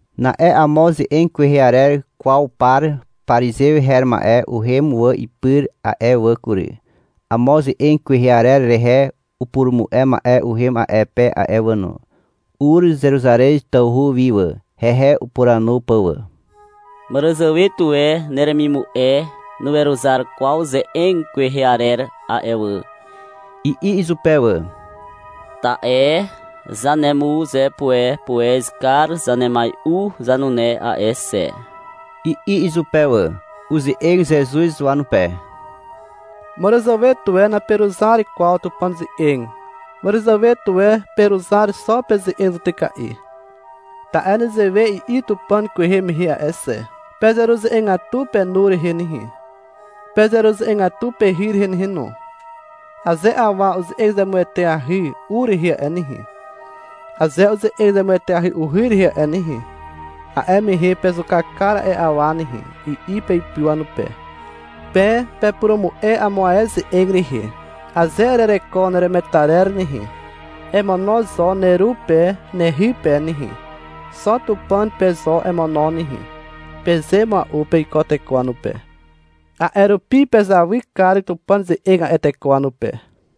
Na'e amo ze'eg kwehe arer kwaw par parizew her ma'e uhem wà ipyr a'e wà kury. Amo ze'eg kwehe arer rehe upurumu'e ma'e uhem a'e pe a'e wà no. Ur Zeruzarez tawhu wi wà, hehe upuranu pà wà. Màràzàwe tuwe neremimu'e nuweruzar kwaw ze'eg kwehe arer a'e wà, i'i izupe wà. — Ta'e zanemuzepuepuez kar zanemai'u zanune a'e xe, i'i izupe wà. Uze'eg Zezuz wanupe. Màràzàwe tuwe naperuzar kwaw Tupàn ze'eg. — Màràzàwe tuwe peruzar xo peze'eg zutyka'i. Ta'e nezewe i'i Tupàn kwehe mehe a'e xe. Pezeruze'egatu penu rehe nehe, Pezeruze'egatu pehy rehe nehe no. Aze awa uze'eg zemueteahy u rehe a'e nehe, Aze uze'eg zemueteahy uhy rehe a'e nehe, A'e mehe pezuka kar a'e awa nehe, i'i peipy wanupe. Pe pepurumu'e amo ae ze'eg rehe. — Aze erereko neremetarer nehe, emono zo neru pe nehy pe nehe, xo Tupàn pe zo emono nehe, peze mua'u peiko teko wanupe. A'e rupi pezawy kar Tupàn ze'eg a'e teko wanupe.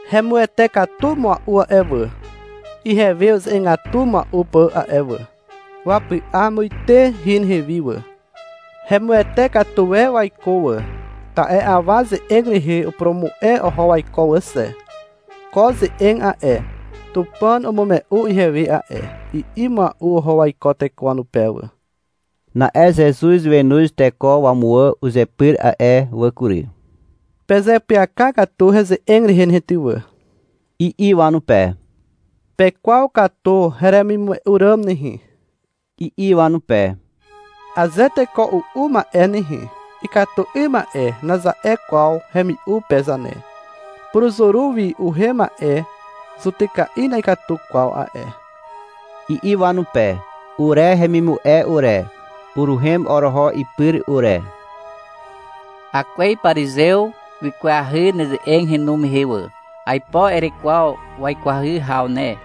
Hemuwete katu mua'u a'e wà, Ihewe uze'egatu mua'u pà a'e wà. Wapy'a muite hin ihewi wà. Hemuwete katu e waiko wà, Ta'e awa ze'eg rehe upurumu'e oho waiko wà xe. — Ko ze'eg a'e, Tupàn umume'u ihewe a'e, i'i mua'u oho waiko teko wanupe wà. Na'e Zezuz wenoz teko wamuwà uzepyr a'e wà kury. — Pezeapyaka katu heze'eg rehe nehe ty wà, i'i wanupe. — Pekwaw katu heremimume'u ràm nehe, i'i wanupe. Aze teko u'u ma'e nehe, — Ikatu 'ym ma'e, naza'e kwaw hemi'u pe zane. Puruzuru wi uhem ma'e zutyka'i na'ikatu kwaw a'e, i'i wanupe. Ure hemimu'e ure, uruhem oroho ipyr ure. — Akwez parizew wikwahy neze'eg henu mehe wà. Aipo erekwaw wakwahy haw ne,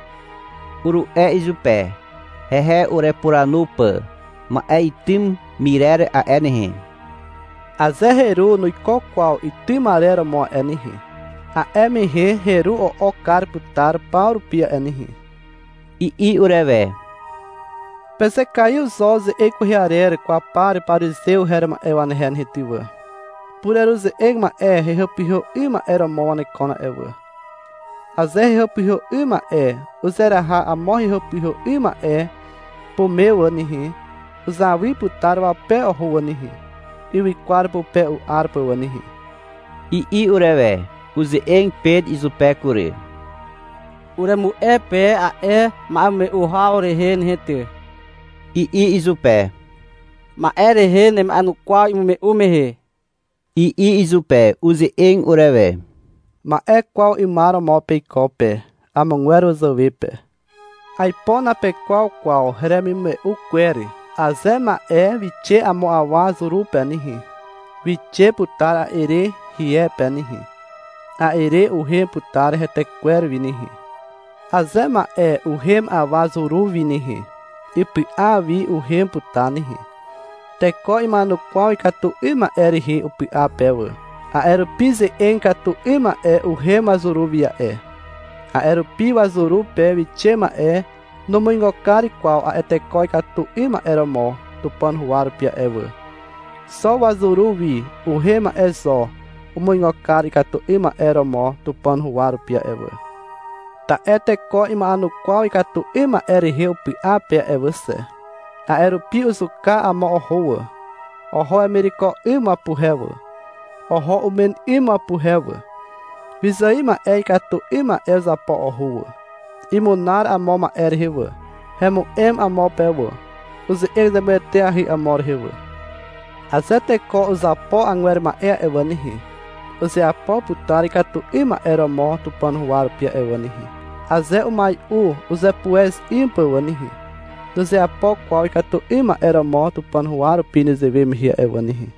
uru'e izupe, hehe urepuranu pà. — Ma'e itym myrer a'e nehe, aze heru nuiko kwaw itym arer romo a'e nehe, a'e mehe heru o'ok kar putar paw rupi a'e nehe, i'i urewe. — Pezekaiw zo ze'eg kwehe arer kwaw par parizew her ma'e wanehe nehe ty wà. Pureruze'eg ma'e hehàpyhà 'ym ma'e romo wanekon a'e wà. Aze hehàpyhà 'ym ma'e uzeraha amo hehàpyhà 'ym ma'e pume wà nehe, uzawy putar wape oho wà nehe, ywykwar pupe u'ar pà wà nehe, i'i urewe. Uze'eg Pet izupe kury. — Uremu'e pe a'e ma'emume'u haw rehe nehe ty, i'i izupe. — Ma'e rehe nema'enukwaw imume'u mehe, i'i izupe. Uze'eg urewe. — Ma'e kwaw 'ymar romo peiko pe, amogwer wazàwe pe. Aipo napekwaw kwaw heremimume'u kwer. Aze ma'e wixe amo awa zuru pe nehe, wixe putar a'e re hie pe nehe. A'e re uhem putar hetekwer wi nehe. Aze ma'e uhem awa zuru wi nehe, ipy'a wi uhem putar nehe. Teko ima'enukwaw ikatu 'ym ma'e rehe upy'a pe wà. A'e rupi ze'eg ikatu 'ym ma'e uhem wazuru wi a'e. A'e rupi wazuru pe wixe ma'e numuigo kar kwaw a'e teko ikatu 'ym ma'e romo Tupàn huwa rupi a'e wà. Xo wazuru wi uhem ma'e zo umuigo kar ikatu 'ym ma'e romo Tupàn huwa rupi a'e wà. Ta'e teko ima'enukwaw ikatu 'ym ma'e rehe upy'a pe a'e wà xe. A'e rupi uzuka amo oho wà. Oho wemireko 'ym wapuhe wà, oho umen 'ym wapuhe wà. Wyzài ma'e ikatu 'ym ma'e uzapo oho wà. Imunar amo ma'e rehe wà. Hemu'em amo pe wà, uze'eg zemueteahy amo rehe wà. Aze teko uzapo agwer ma'e a'e wà nehe, uzeapo putar ikatu 'ym ma'e romo Tupàn huwa rupi a'e wà nehe. Aze umai'u uzepuez 'ym pà wà nehe, nuzeapo kwaw ikatu 'ym ma'e romo Tupàn huwa rupi nezewe mehe a'e wà nehe.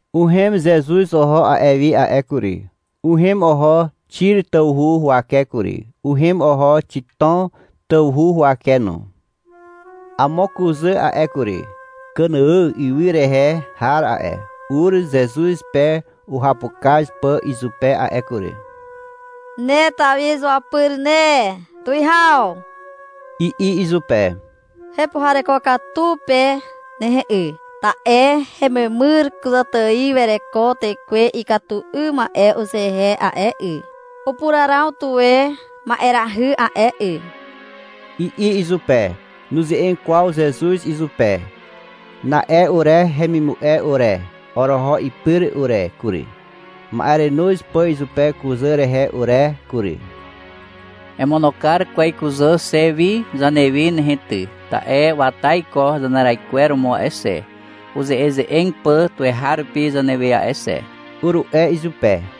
Uhem Zezuz oho a'e wi a'e kury. Uhem oho Xir tawhu huwake kury. Uhem oho Xitom tawhu huwake no. Amo kuzà a'e kury, Kànàà ywy rehe har a'e, ur Zezuz pe uhapukaz pà izupe a'e kury. — Ne Tawi izuapyr ne, tuwihaw, i'i izupe. — Hepuhareko katu pe nehe 'y, ta'e hememyr kuzàtài wereko tekwe ikatu 'ym ma'e uzehe a'e 'y. Upuraraw tuwe ma'erahy a'e 'y, i'i izupe. Nuze'eg kwaw Zezuz izupe. Na'e ure hemimu'e ure, oroho ipyr ure kury, ma'erenoz pà izupe kuzà rehe ure kury. — Emono kar kwez kuzà xe wi zanewi nehe ty, ta'e wata iko zaneraikweromo a'e xe, uze'eze'eg pà tuweharupi zanewe a'e xe, uru'e izupe.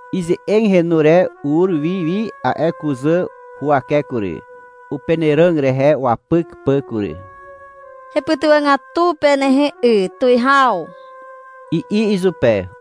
Ize'eg henu re ur wi wi a'e kuzà huwake kury, upenàràg rehe wapyk pà kury. — Hepytywàgatu pe nehe 'y tuwihaw, i'i izupe.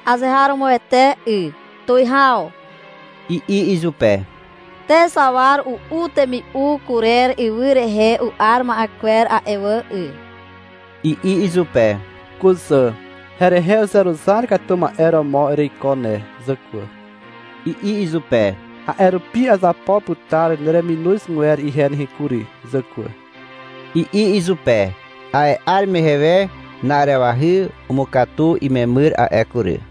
— Azeharomoete 'y, tuwihaw, i'i izupe. — Te zawar u'u temi'u kurer ywy rehe u'ar ma'e kwer a'e wà 'y, i'i izupe. — Kuzà, herehe uzeruzar katu ma'e romo ereiko ne zàkwà, i'i izupe. — A'e rupi azapo putar nereminozgwer ihe nehe kury zàkwà, i'i izupe. A'e 'ar mehe we, na'arewahy umukatu imemyr a'e kury.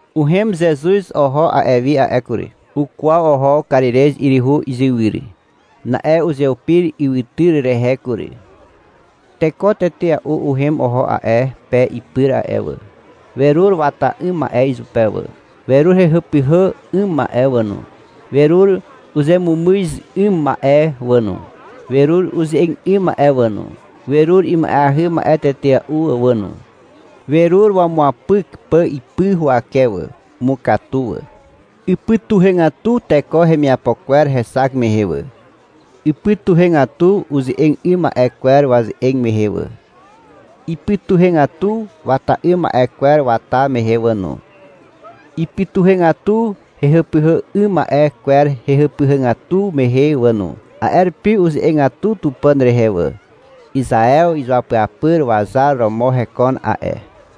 Uhem Zezuz oho a'e wi a'e kury. Ukwaw oho Karirez 'yryhu izywyr. Na'e uzeupir ywytyr rehe kury. Teko tetea'u uhem oho a'e pe ipyr a'e wà. Werur wata 'ym ma'e izupe wà. Werur hehàpyhà 'ym ma'e wà no, werur uzemumyz 'ym ma'e wà no, werur uze'eg 'ym ma'e wà no, werur ima'eahy ma'e tetea'u wà no. Werur wamuapyk pà ipy huwake wà. Umukatu wà. Ipytuhegatu teko hemiapo kwer hexak mehe wà. Ipytuhegatu uze'eg 'ym ma'e kwer waze'eg mehe wà, ipytuhegatu wata 'ym ma'e kwer wata mehe wà no, ipytuhegatu hehàpyhà 'ym ma'e kwer hehàpyhàgatu mehe wà no. A'e rupi uze'egatu Tupàn rehe wà. (Izaew izuapyapyr wazar romo hekon a'e.)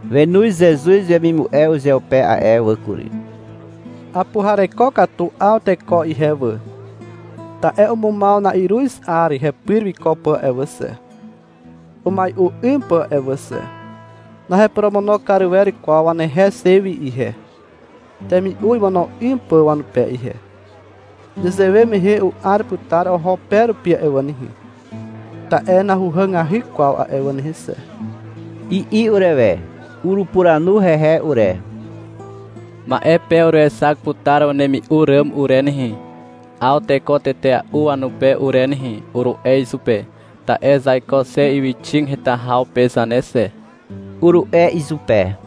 Wenoz Zezuz wemimu'e uzeupe a'e wà kury. — Apuhareko katu 'aw teko ihe wà, ta'e umumaw na'iruz 'ar hepyr wiko pà a'e wà xe, umai'u 'ym pà a'e wà xe. Naheporomono kar wer kwaw wanehe xe wi ihe, temi'u imono 'ym pà wanupe ihe. Nezewe mehe u'ar putar oho pe rupi a'e wà nehe, ta'e nahuhàgahy kwaw a'e wà nehe xe, i'i urewe. Urupuranu hehe ure. — Ma'e pe uruexak putar wanemi'u ràm ure nehe, 'aw teko tetea'u wanupe ure nehe, uru'e izupe. — Ta'e zaiko xe ywyxig heta haw pe zane xe, uru'e izupe.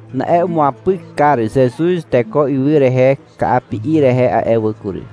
Na'e umuapyk kar Zezuz teko ywy rehe ka'api'i rehe a'e wà kury.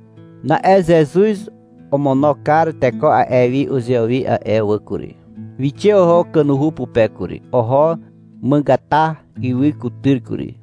Na'e Zezuz omono kar teko a'e wi uzewi a'e wà kury. Wixe oho kanuhu pupe kury. Oho Màgàtà ywy kutyr kury.